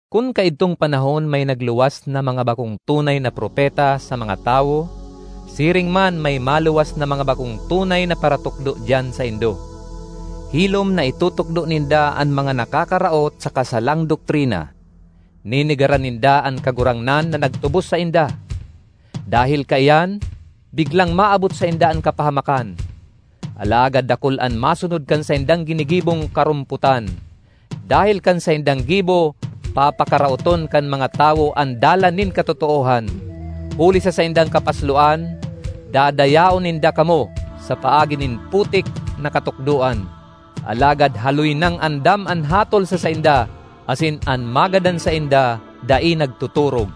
Kun kaidtong panahon may nagluwas na mga bakong tunay na propeta sa mga tawo, siring man may maluwas na mga bakong tunay na paratukdo diyan saindo. Hilom na itutukdo ninda an mga nakakaraot saka salang doktrina; nenegaran ninda an Kagurangnan na nagtubos sainda. Dahel kaiyan, biglang maabot sainda an kapahamakan. Alagad dakul an masunod kan saindang ginigibong karompotan; dahel kan saindang gibo papakaraoton kan mga tawo an Dalan nin katotoohan. Huli sa saindang kapasloan, dadayaon ninda kamo sa paagi nin putik na katukdoan; alagad haloy nang andam an hatol sa sainda asin an magadan sainda dai nagtotorog!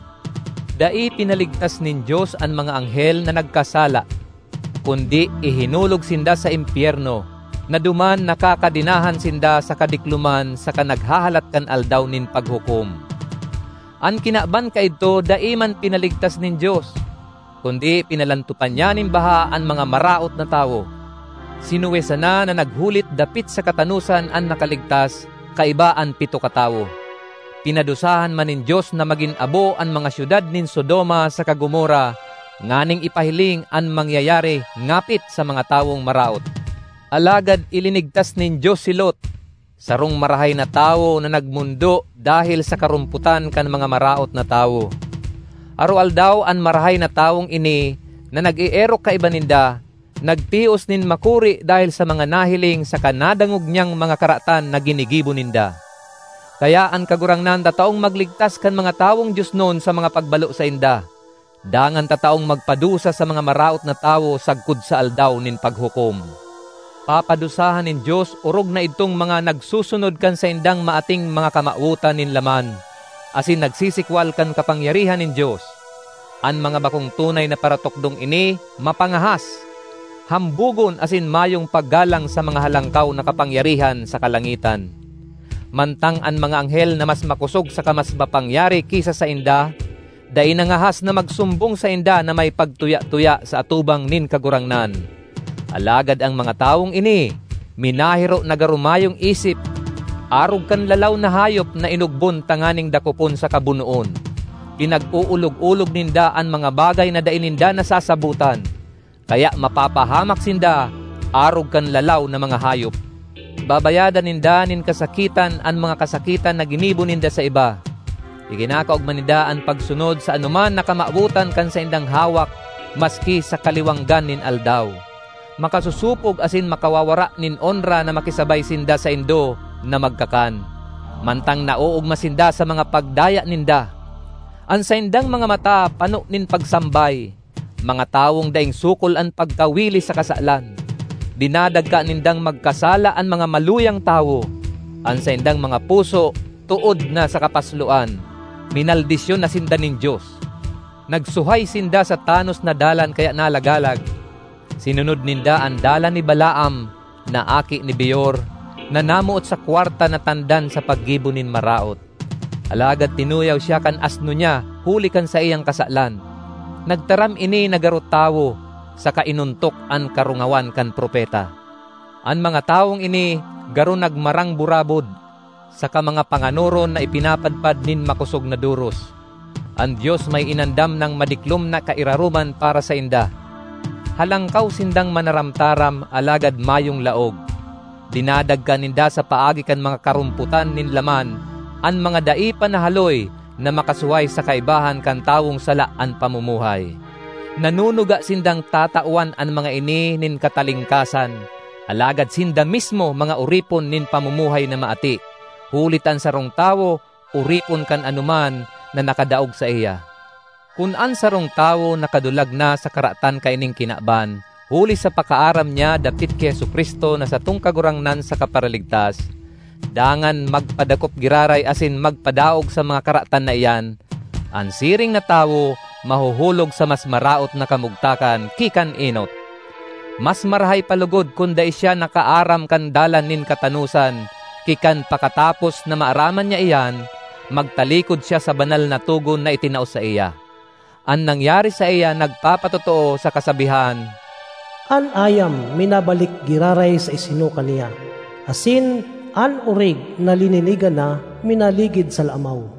Dai pinaligtas nin Dios an mga anghel na nagkasala, kundi ihinulog sinda sa impyerno, na duman nakakadenahan sinda sa kadikloman saka naghahalat kan Aldaw nin Paghukom. An kinaban kaidto dai man pinaligtas nin Dios, kundi pinalantopan niya nin baha an mga maraot na tawo. Si Noe sana na naghulit dapit sa katanosan an nakaligtas, kaiba an pito katawo. Pinadusahan man nin Dios na magin abo an mga syudad nin Sodoma saka Gomorra nganing ipahiling an mangyayari ngapit sa mga tawong maraot. Alagad ilinigtas nin Dios si Lot, sarong marahay na tawo na nagmondo dahel sa karompotan kan mga maraot na tawo. Aroaldaw an marahay na tawong ini, na nag-eerok kaiba ninda, nagtios nin makuri dahel sa mga nahiling saka nadangog niyang mga karatan na ginigibo ninda. Kaya an Kagurangnan tataong magligtas kan mga tawong diosnon sa mga pagbalo sainda, dangan tataong magpadusa sa mga maraot na tawo sagkod sa Aldaw nin Paghukom. Papadusahan nin Dios orog na idtong mga nagsusunod kan saindang maating mga kamawotan nin laman, asin nagsisikwal kan kapangyarihan nin Dios. An mga bakong tunay na paratukdong ini mapangahas, hambogon asin mayong paggalang sa mga halangkaw na kapangyarihan sa kalangitan. Mantang an mga anghel na mas makosog saka mas mapangyari ki sa sainda, dai nangahas na magsumbong sainda na may pagtuya-tuya sa atubang nin Kagurangnan; alagad an mga tawong ini minahiro na garo mayong isip, arog kan lalaw na hayop na inogbon tanganing dakopon saka bunoon. Pinag-oolog-olog ninda an mga bagay na dai ninda nasasabotan. Kaya mapapahamak sinda arog kan lalaw na mga hayop; babayadan ninda nin kasakitan an mga kasakitan na ginibo ninda sa iba. Ikinakaogma ninda an pagsunod sa anoman na kamawotan kan saindang hawak maski sa kaliwanggan nin aldaw; makasosopog asin makawawara nin onra na makisabay sinda saindo na magkakan, mantang naoogma sinda sa mga pagdaya ninda! An saindang mga mata pano nin pagsambay; mga tawong daing sukol an pagkawili sa kasalan. Dinadagka nindang magkasala an mga maluyang tawo. An saindang mga puso tood na sa kapasloan. Minaldisyon na sinda nin Dios! Nagsuhay sinda sa tanos na dalan kaya nalagalag; sinunod ninda an dalan ni Balaam na aki ni Beor, na namoot sa kwarta na tandan sa paggibo nin maraot. Alagad tinuyaw siya kan asno niya huli kan saiyang kasalan. Nagtaram ini na garo tawo, saka inontok an karungawan kan propeta. An mga tawong ini garo nagmarang burabod, saka mga panganoron na ipinapadpad nin makosog na doros; an Dios may inandam nang madiklom na kairaroman para sainda. Halangkaw sindang manaramtaram alagad mayong laog; dinadagka ninda sa paagi kan mga karompotan nin laman an mga dai pa nahaloy na makasuhay sa kaibahan kan tawong sala an pamumuhay. Nanunuga sindang tatawan an mga ini nin katalingkasan; alagad sinda mismo mga oripon nin pamumuhay na maati—huli ta an sarong tawo oripon kan anoman na nakadaog saiya. Kun an sarong tawo nakadulag na sa karatan kaining kinaban, huli sa pakaaram niya dapit ki Jesu-Cristo na satong Kagurangnan saka Paraligtas, dangan magpadakop giraray asin magpadaog sa mga karatan na iyan, an siring na tawo mahuhulog sa mas maraot na kamugtakan ki kan enot. Mas marahay pa logod kun dai siya nakaaram kan dalan nin katanosan ki kan pakatapos na maaraman niya iyan, magtalikod siya sa banal na togon na itinao saiya. An nangyari saiya nagpapatotoo sa kasabihan, “An ayam minabalik giraray sa isinuka niya,” asin “An orig na lininigan na, minaligid sa lamaw.”